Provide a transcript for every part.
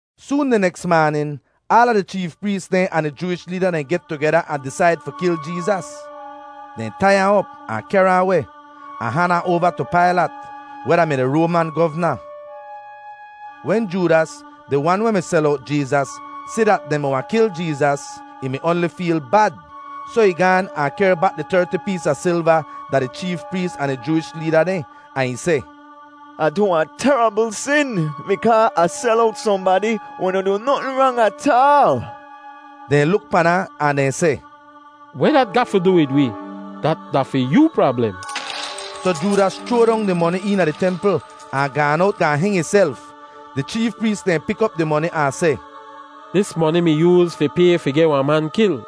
Soon di neks maanin, aala di cheef prees dehn ahn di Jooish leeda dehn get tugeda ahn disaid fi kil Jeezas. Dehn tai ahn op ahn kehr ahn weh, ahn han ahn oava tu Pailat, weh da-mi di Roaman govna. Wen Joodas, di wan weh mi sel owt Jeezas, si dat dehn mi wahn kil Jeezas, ih mi oanli feel bad. Soh ih gaan ahn ih kehr bak di terti pees a silva da di cheef prees ahn di Jooish leeda dehn, ahn ih seh, “Ah du wahn terabl sin bikaa Ah sel owt sohnbadi weh noh du notn rang ataal.” Dehn luk pan ahn, ahn dehn seh, “Weh dat ga fi du wid wee? Dat da fi yoo prablem.” Soh Joodas chroa dong di moni eena di templ ahn gaan owt gaahn heng ihself. Di cheef prees dehn pik op di moni ahn seh, “Dis moni mi yooz fi pay fi geh wahn man kil,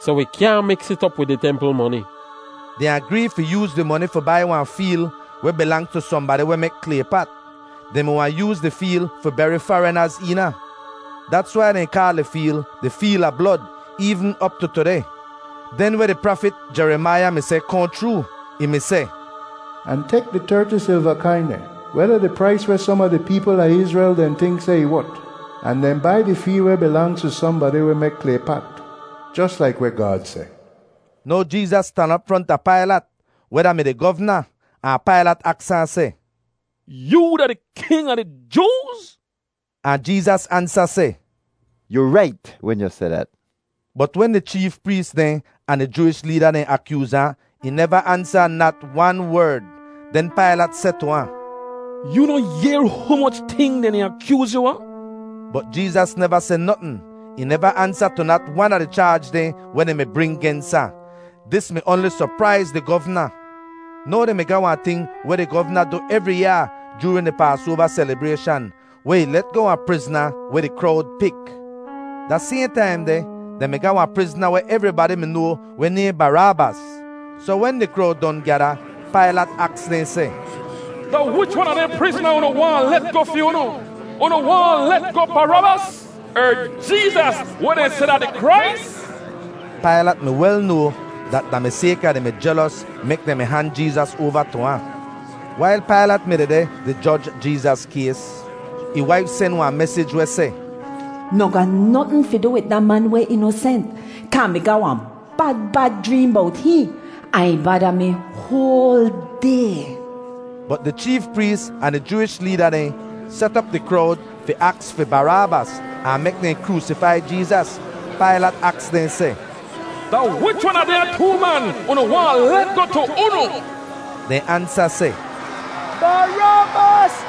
soh wi kyaahn miks it op wid di templ moni.” Dehn agree fi yooz di moni fi bai wahn feel weh bilangz tu sohnbadi weh mek klay pat. Dehn mi waahn yooz di feel fi beri farinaz eena. Dats wai dehn kaal di feel di Feel a Blod eevn op tu tudeh. Den weh di prafit Jerimaiya mi seh kohn chroo. Ih mi seh, “Ahn tek di terti silva kain dehn, weh da di prais weh som a di peepl a Izrel dehn tink seh ih wot. Ahn dehn bai di feel weh bilangz tu sohnbadi weh mek klay pat, jos laik weh Gaad seh.” Now Jeezas stan op fronta Pailat, weh da-mi di govna, ahn Pailat aks ahn seh, “Yoo da di king a di Jooz?” Ahn Jeezas ansa seh, “Yu rait wen yu seh dat.” Bot wen di cheef prees dehn ahn di Jooish leeda dehn akyooz ahn, ih neva ansa nat wan werd. Den Pailat seh tu ahn, “Yoo noh yehr humoch ting dehn di akyooz yu a?” Bot Jeezas neva seh notn. Ih neva ansa tu nat wan a di chaaj dehn weh dehn mi bring gens ahn. Dis mi oanli sopraiz di govna. Now dehn mi ga wahn ting weh di govna du evri yaa joorin di Paasoava selibrayshan, weh ih let goh wahn prizna weh di krowd pik. Da sayhn taim deh dehn mi ga wahn prizna weh evribadi mi noa weh nayhn Baraabas. Soh wen di krowd don gyada, Pailat aks dehn seh, “Da wich wan a dehn prizna unu waahn Ah let goh fi unu? Unu waahn Ah let goh Baraabas, er Jeezas weh dehn seh da di Krais?” Pailat mi wel noa dat da mi sayka dehn mi jelos mek dehn mi han Jeezas oava tu ahn. Wail Pailat mi dehdeh di joj Jeezas kays, ih waif sen wahn mesij weh seh, “Noh ga notn fi du wid da man weh inosent, kaa Ah mi ga wahn bad bad jreem bowt hihn, ahn ih bada mi hoal day.” Bot di cheef prees ahn di Jooish leeda dehn set op di krowd fi aks fi Baraabas ahn mek dehn kroosifai Jeezas. Pailat aks dehn seh, “Da wich wan a dehnya too man unu waahn Ah let goh tu unu?” Dehn ansa seh, “Baraabas.”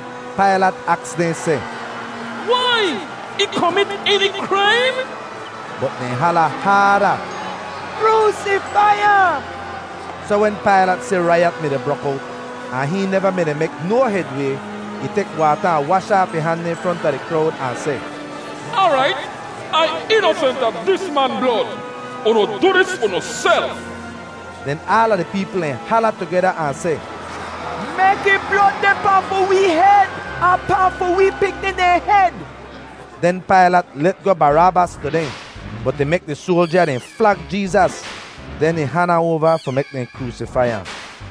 Pailat aks dehn seh, “Wai? Ih komit eni kraim?” Bot dehn hala haada, “Kroosifai ahn!” Soh wen Pailat si raiyat mi-di brok owt ahn hihn neva mi-di mek no hedway, ih tek waata ahn wash aaf ih han dehn fronta di krowd ahn seh, “Aarait, Ai inosent a dis man blod. Unu du dis unuself.” Den aala di peepl dehn hala tugeda ahn seh, “Mek ih blod deh pahn fi wee hed, ahn pahn fi wi pikni dehn hed!” Den Pailat let goh Baraabas tu dehn. Bot ih mek di soalja dehn flag Jeezas. Den ih han ahn oava fi mek dehn kroosifai ahn.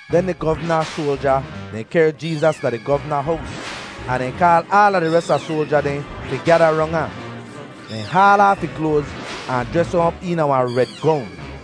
Den di govna soalja dehn kehr Jeezas da di govna hows ahn dehn kaal aala di res a soalja dehn fi gyada rong ahn. Dehn haal aaf ih kloaz ahn jres ahn op eena wahn red gong;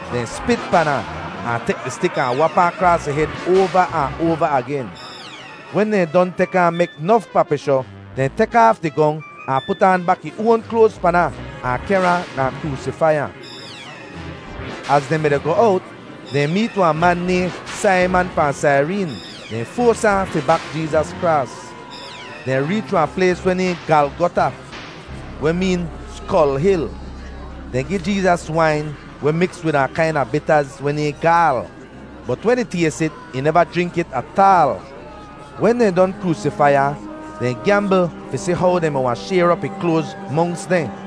Dehn spit pan ahn, ahn tek di stik ahn wap ahn kraas ih hed oava ahn oava agen. Wen dehn don tek ahn mek nof papishoh, dehn tek aaf di gong ahn put aan bak ih oan kloaz pan ahn, ahn kehr ahn gaahn kroosifai ahn. Az dehn mi-di goh owt, dehn meet wahn man nayhn Saiman fahn Saireen. Dehn foas ahn fi bak Jeezas kraas. Dehn reech wahn plays weh nayhn Galgota, weh meen “Skol Hil.” Dehn gi Jeezas wain weh miks wid wahn kaina bitaz weh nayhn gaal, bot wen ih tays it, ih neva jrink it ataal. Wen dehn don kroosifai ahn, dehn gyambl fi si how dehn mi wahn shayr op ih kloaz monks dehn.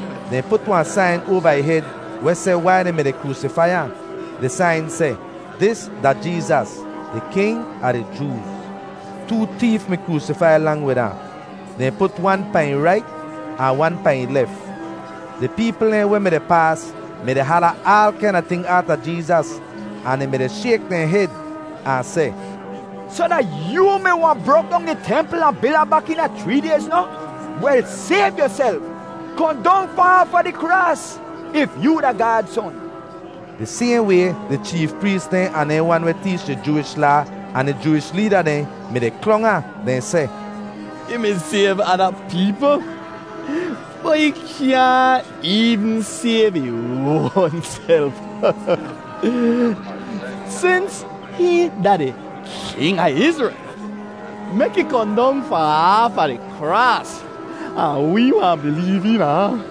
Dehn put wahn sain oava ih hed weh seh wai dehn mi-di kroosifai ahn. Di sain seh: dis da jeezas, di king a di jooz. Too teef mi kroosifai lang wid ahn. Dehn put wan pahn ih rait ahn wan pahn ih lef. Di peepl dehn weh mi-di paas mi-di hala aal kaina ting aata Jeezas ahn dehn mi-di shayk dehn hed ahn seh, “Soh, da yoo mi wahn brok dong di templ ahn bil ahn bak eena chree dayz noh? Wel, sayv yuself. Kohn dong fahn aafa di kraas if yoo da Gaad Son.” Di sayhn way di cheef prees dehn ahn dehn wan weh teech di Jooish Laa ahn di Jooish leeda dehn mi-di klong ahn. Dehn seh, “Ih mi sayv ada peepl, bot ih kyaahn eevn sayv ih oanself! Sins hihn da di King a Izrel, mek ih kohn dong fahn aafa di kraas, ahn wee wahn bileev eena ahn.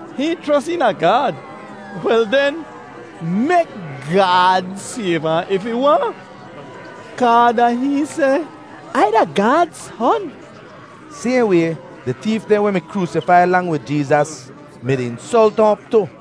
Hihn chros eena Gaad. Wel den, mek Gaad sayv ahn if ih waahn, kaa da hihn seh, ‘Ai da Gaad Son.’” Sayhn way, di teef dehn weh mi kroosifai lang wid Jeezas mi-di insolt ahn op tu.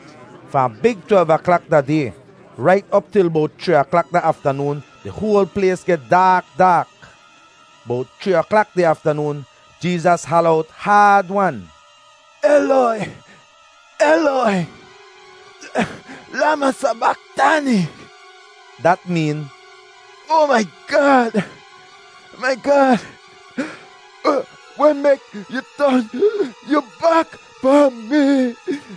Fahn big twelv aklak da day rait op til bowt chree aklak da aftanoon di hoal plays geh daak daak. Bowt chree aklak di aftanoon Jeezas hala owt haad-wan, “Eloi, Eloi, lama sabaktani.” Dat meen, “Oa mai Gaad, mai Gaad! Weh mek yu ton yu bak pahn mi?”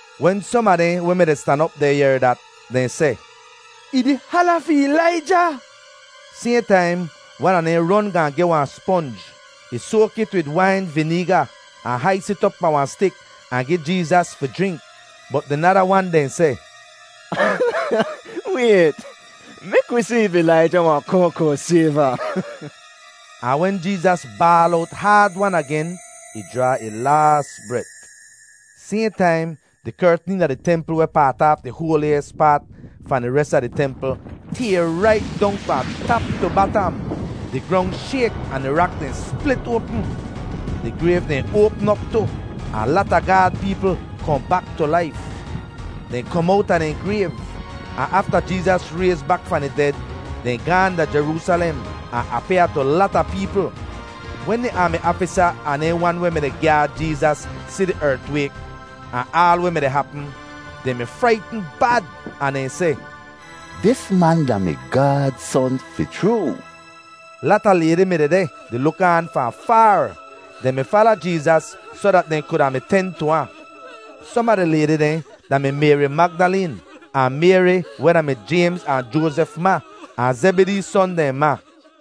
Wen som a dehn weh mi-di stan op deh yehr dat, dehn seh, “Ih di hala fi Ilaija.” Sayhn taim wan a dehn ron gaahn geh wahn sponj. Ih soak it wid wain vineega ahn hais it op pahn wahn stik ahn gi Jeezas fi jrink. Bot di nada wan dehn seh, “Wayt, mek wi si if Ilaija wahn kohn kohn sayv ahn.” Ahn wen Jeezas baal owt haad-wan agen, ih jraa ih laas bret. Sayhn taim di kertn eena di templ weh paat aaf di hoaliyis paat fahn di res a di templ tayr rait dong fahn tap tu batam. Di grong shayk ahn di rak dehn split oapm. Di grayv dehn oapm op tu, ahn lata Gaad peepl kohn bak tu laif. Dehn kom owta dehn grayv, ahn afta Jeezas rayz bak fahn di ded, dehn gaahn da Jeroosalem ahn apyaa tu lata peepl. Wen di aami aafisa ahn dehn wan weh mi-di gyaad Jeezas si di ertwayk ahn aal weh mi-di hapm, dehn mi fraitn bad ahn dehn seh, “Dis man da-mi Gaad Son fi chroo!” Lata laydi mi dehdeh di luk aan fahn faar. Dehn mi fala Jeezas soh dat dehn kuda mi ten tu ahn. Som a di laydi dehn da-mi Mayri Magdaleen ahn Mayri weh da-mi Jaymz ahn Joazef ma, ahn Zebidee son dehn ma.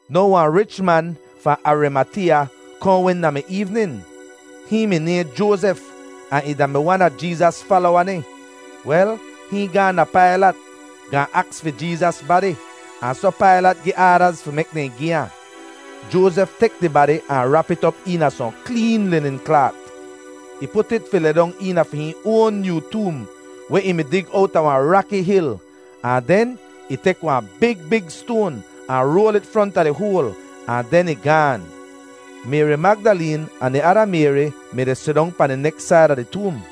Now wahn rich man fahn Arimateeya kohn wen da mi eevnin. Hihn mi nayhn Joazef ahn ih da-mi wan a Jeezas falowa dehn. Wel, hihn gaahn da Pailat gaahn aks fi Jeezas badi, ahn soh Pailat gi aadaz fi mek dehn gi ahn. Joazef tek di badi ahn rap it op eena sohn kleen linin klaat. Ih put it fi lidong eena fi hihn oan nyoo toom weh ih mi dig owta wahn raki hil. Ahn den ih tek wahn big big stoan ahn roal it fronta di hoal, ahn den ih gaan. Mayri Magdaleen ahn di ada Mayri mi-di sidong pahn di neks said a di toom.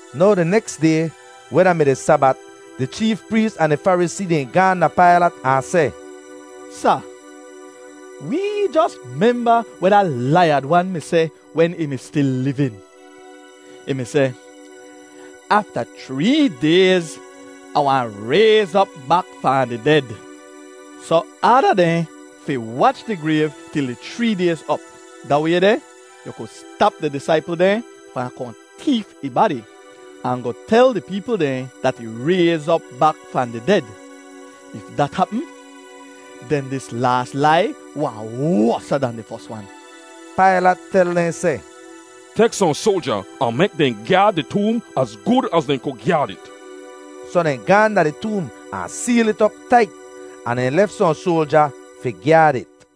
Now di neks day, weh da-mi di Sabat, di cheef prees ahn di Farisee dehn gaahn da Pailat ahn seh, “Sa, wee jos memba weh da laiyad wan mi seh wen ih mi stil livin. Ih mi seh, ‘Afta chree dayz Ah wahn rayz op bak fahn di ded.’ Soh aada dehn fi wach di grayv til di chree dayz op; da way deh yu ku stap di disaipl dehn fahn kohn teef ih badi ahn goh tel di peepl dehn dat ih rayz op bak fahn di ded. If dat hapm, den dis laas lai wahn wosa dan di fos wan.” Pailat tel dehn seh, “Tek sohn soalja ahn mek dehn gyaad di toom az gud az dehn ku gyaad it.” Soh dehn gaahn da di toom ahn seel it op tait, ahn dehn lef sohn soalja fi gyaad it.